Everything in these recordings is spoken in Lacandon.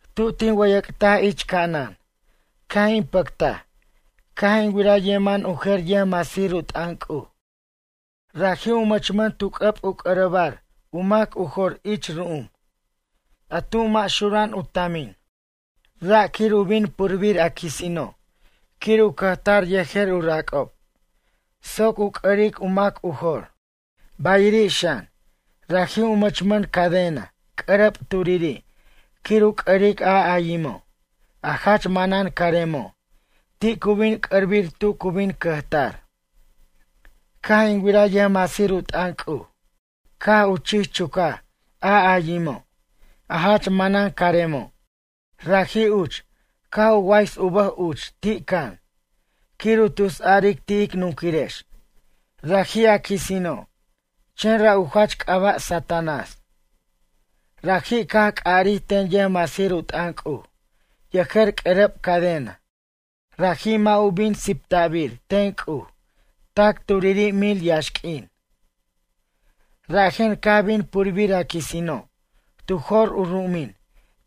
Tu tin wʌyʌc'taj ich ca'anan, caj in pʌctaj caj in wiraj yeman u jer yʌjmasir u t'ʌn C'uj. Raji' u mʌchmʌn tu c'ʌb u c'ʌrʌbar u mac u jor ich ru'um, a tu mʌ' xura'an u tamin, ra' quir u bin purbir a quisino' quir u cʌjtar yejer u rac'ob, soc u c'ʌric a mac u jor. Bayiri' xan, raji' u mʌchmʌn cadena c'ʌrʌb turiri' quir u c'ʌric a ayimo', a jach manan caremo' ti' cu bin c'ʌrbir tu cu bin cʌjtar. Caj in wiraj yʌjmasir u t'ʌn C'uj caj u chich chucaj a ayimo', a jach manan caremo'. Raji' uch, caj u ways u bʌj uch ti' can quir u tus aric ti' ic nunquirex, raji' a quisino' chen ra' u jach c'aba' Satanás. Raji' caj c'ʌrij ten yʌjmasir u t'ʌn C'uj yejer c'ʌrʌb cadena. Raji' mʌ' u bin sipta'bir ten C'uj tac turiri' mil yaxq'uin. Rajen caj bin purbir a quisino' tu jor u ru'umin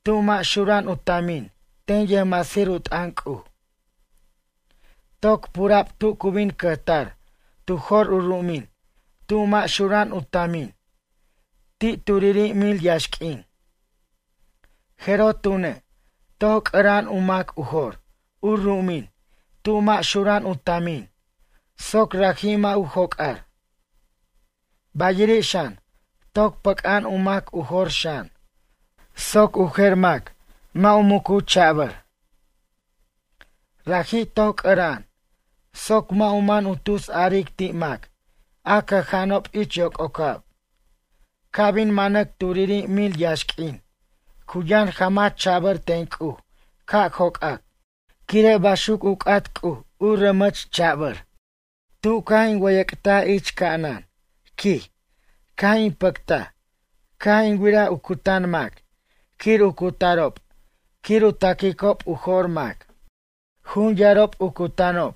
tu mʌ' xura'an u tamin ten yʌjmasir u t'ʌn C'uj. Toc pura'b tu cu bin cʌjtar tu jor u ru'umin tu mʌ' xura'an u tamin ti' turiri' mil yaxq'uin. Jeroj tune', toc c'ʌra'an u mac u jor u ru'umin tu mʌ' xura'an u tamin soc raji' mʌ' u joc'ar. Bayiri' xan, toc pʌc'a'an u mac u jor xan, soc u jer mac mʌ' u mucu cha'bʌr. Raji' toc c'ʌra'an soc mʌ' u man u tus aric ti' mac a cʌja'anob ich yoc'ocab. Ca' bin manac turiri' mil yaxq'uin cu yʌn jamach cha'bʌr ten C'uj ca' joc'ac, quire' baxuc u c'at C'uj u ramach cha'bʌr C'uj. Tu caj in wʌyʌc'taj ich ca'anan, quij, caj in pʌctaj caj in wiraj u cutan mac quir u cutarob quir u taquicob u jo'r mac. Jun yarob u cutanob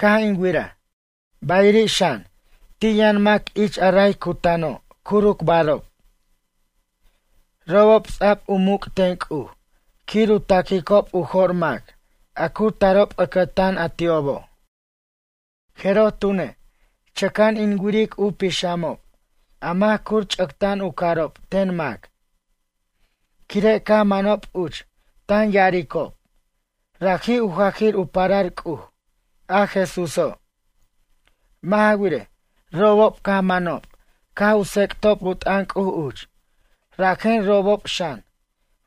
caj in wiraj, bayiri' xan, ti' yʌn mac ich a ray cutanob curucbarob. Robob ts'a'b u muc' ten C'uj quir u taquicob u jo'r mac a cu tarob ʌcʌtan a ti'obo'. Jeroj tune', chʌca'an in wiric u pixamob a mac curch'acta'an u carob ten mac, quire' caj manob uch tan ya'aricob, raji' u jajir u parar C'uj, a Jesúso'. Mʌ' ja wirej, robob caj manob caj u tsec'tob u t'ʌn C'uj uch. Rajen robob xan,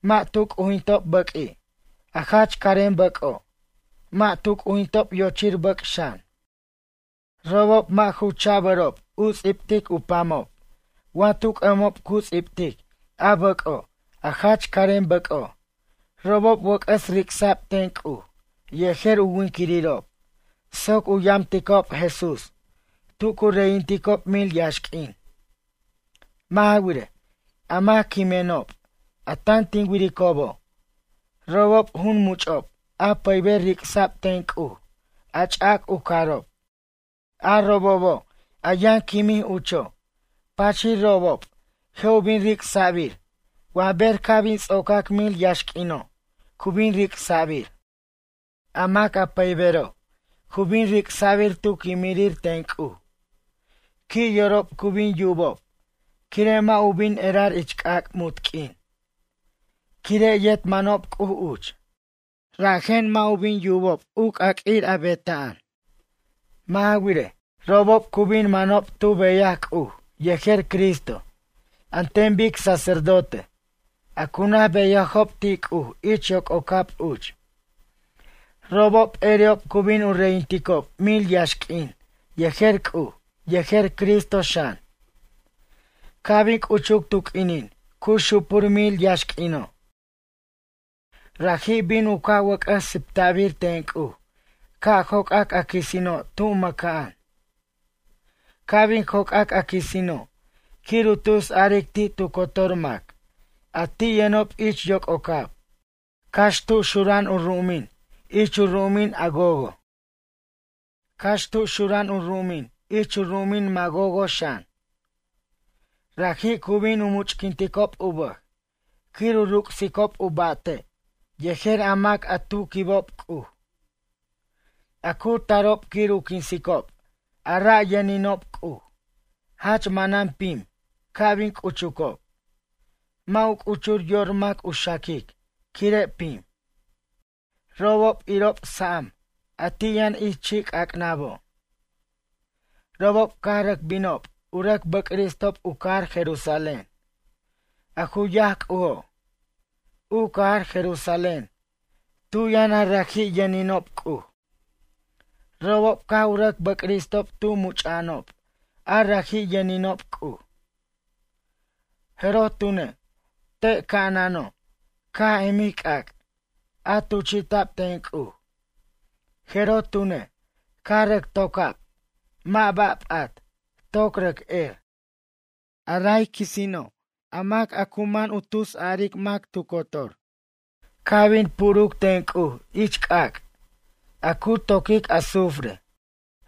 mʌ' tu c'ujintob bʌq'ui', a jach carem bʌc'o', mʌ' tu c'ujintob yochir bʌc' xan. Robob mʌ' ju cha'bʌrob u ts'ibt tu pamob wa tu c'ʌbo' cu ts'ibtic a bʌc'o', a jach carem bʌc'o'. Robob wʌc'ʌs ric'sa'b ten C'uj yejer u winquirirob soc u yamticob Jesús tu cu reyinticob mil yaxq'uin. Mʌ' ja wirej, a mac quimenob, a tan tin wiricobo', robob, jun much'ob a pʌyber ric'sa'b ten C'uj a ch'ac u carob. A robobo' a yʌn quimij ucho', pachir robob je' u bin ric'sa'bir wa ber ca' bin ts'ocac mil yaxq'uino' cu bin ric'sa'bir. A mac a pʌybero', cu bin ric'sa'bir tu quimirir ten C'uj, qui' yorob cu bin yubob, quire' mʌ' u bin erar ich c'ac' munt q'uin. Quire' yet manob C'uj uch, rajen, mʌ' u bin yubob u c'aq'uir benaj. Mʌ' ja wirej, robob cu bin manob tu beyaj C'uj yejer Cristo an ten bic sacerdote, a cu naj beyajob ti' C'uj ich yoc'ocab uch. Robob p'eri'ob cu bin u reyinticob mil yaxq'uin yejer C'uj yejer Cristo xan. Ca' bin c'uchuc tu q'uinin cu xupur mil yaxq'uino'. Raji' bin u ca' u wʌc'ʌs sip'tbir ten C'uj ca' joc'ac a quisino' tu maca'an. Ca' bin joc'ac a quisino', quir u tus aric ti' tu cotor mac a ti' yʌnob ich yoc'ocab, cax tu xura'an u ru'umin ich u ru'umin a Gogo', cax tu xura'an u ru'umin ich u ru'umin Magogo' xan. Raji' cu bin u much'quinticob u bʌj quir u ric'sicob u ba'te' yejer a mac a tu quibob C'uj. A cu tarob quir u quinsicob a ra' yʌninob C'uj, jach manan pim ca' bin c'uchob, mʌ' u c'uchur yor mac u xaquic quire' pim, robob irob sa'am a ti' yʌn ich chi'c'ac'nabo'. Robob caj rʌc binob u rʌc bʌcristob u cajar Jerusalén, a ju yaj C'ujo', u cajar Jerusalén, tu yʌn a raji' yʌninob C'uj. Robob caj u rʌc bʌcristob tu much'a'anob a raji' yʌninob C'uj. Jeroj tune', te' ca'anano' caj emij c'ac', a tuchi'ta'b ten C'uj, jeroj tune', caj rʌc toca'b, mʌ' ba' p'at, toc rʌc er. A ray quisino', a mac a ju mano' u tus aric mac tu cotor, caj bin puruc ten C'uj ich c'ac', a cu toquic azufre,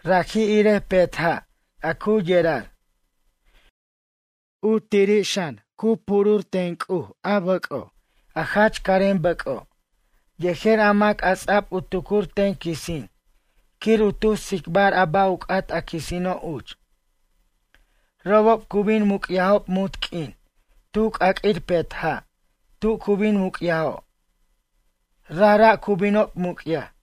raji' irej petja' a cu yerar. U tiri' xan, cu purbir ten C'uj a bʌc'o', a jach carem bʌc'o', yejer a mac a ts'a'b u tucur ten quisin quir u tus tsicbar a ba' u c'at a quisino' uch. Robob cu bin muc'yajob munt q'uin tu c'aq'uir petja' tu cu bin muc'yajo'. Rajra' cu binob muc'yaj.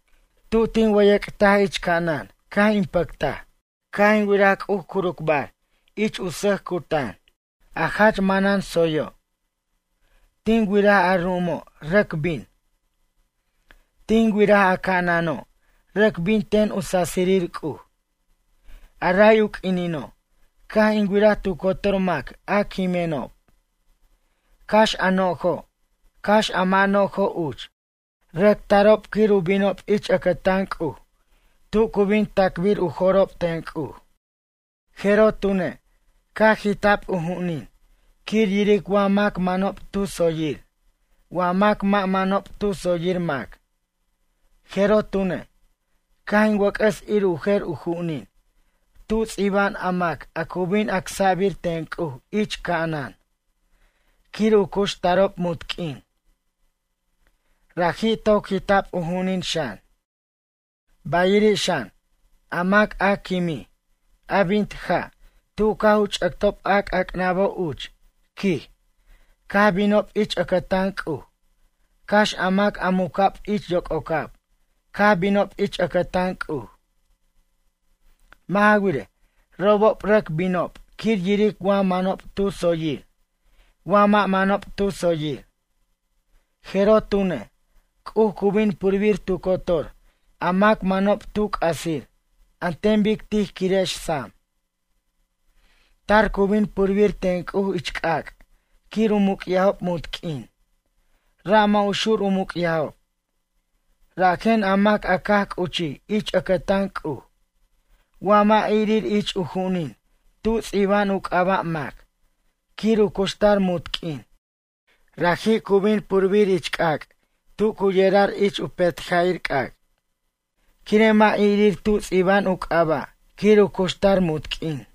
Tu tin wʌyʌc'taj ich ca'anan caj in pʌctaj, caj in wiraj C'uj curucbar ich u sʌc cutan, a jach manan tsoyo'. Tin wiraj a ru'umo' rʌc bin. Tin wiraj a ca'ano', rʌc bin ten u sasirir C'uj. A ray u q'uinino', caj in wiraj tu cotor mac a quimenob, cax a no'jo', cax a mʌ' no'jo' uch. Rʌc tarob quir u binob ich ʌcʌtan C'uj tu cu bin tacbir u jo'rob ten C'uj. Jeroj tune', caj jita'b u ju'unin quir yiric wa mac manob tu tsoyir, wa mac mʌ' manob tu tsoyir mac. Jeroj tune', caj in wʌc'ʌs ir u jer u ju'unin, tu ts'iba'an a mac a cu bin acsa'bir ten C'uj ich ca'anan quir u cuxtarob munt q'uin. Raji' toc jita'b u ju'unin xan. Bayiri' xan, a mac a quimij, a bint ja' tu caj u ch'ʌtob a c'ac'nabo' uch, quij, caj binob ich ʌcʌtan C'uj, cax a mac a muca'b ich yoc'ocab caj binob ich ʌcʌtan C'uj. Mʌ' ja wirej, robob rʌc binob quir yiric wa manob tu tsoyir wa mʌ' manob tu tsoyir. Jeroj tune', C'uj cu bin purbir tu cotor a mac manob tu c'asir an ten bic tij quirex sam. Tar cu bin purbir ten C'uj ich c'ac' quir u muc'yajob munt q'uin, ra' mʌ' u xur u muc'yajob. Rajen a mac a caj c'uchij ich ʌcʌtan C'uj wa mʌ' irir ich u ju'unin tu ts'iba'an u c'aba' mac quir u cuxtar munt q'uin, raji' cu bin purbir ich c'ac' tu cu yerar ich petja'ir c'ac' quire' mʌ' irir tu ts'iba'an u c'aba' quir u cuxtar munt q'uin.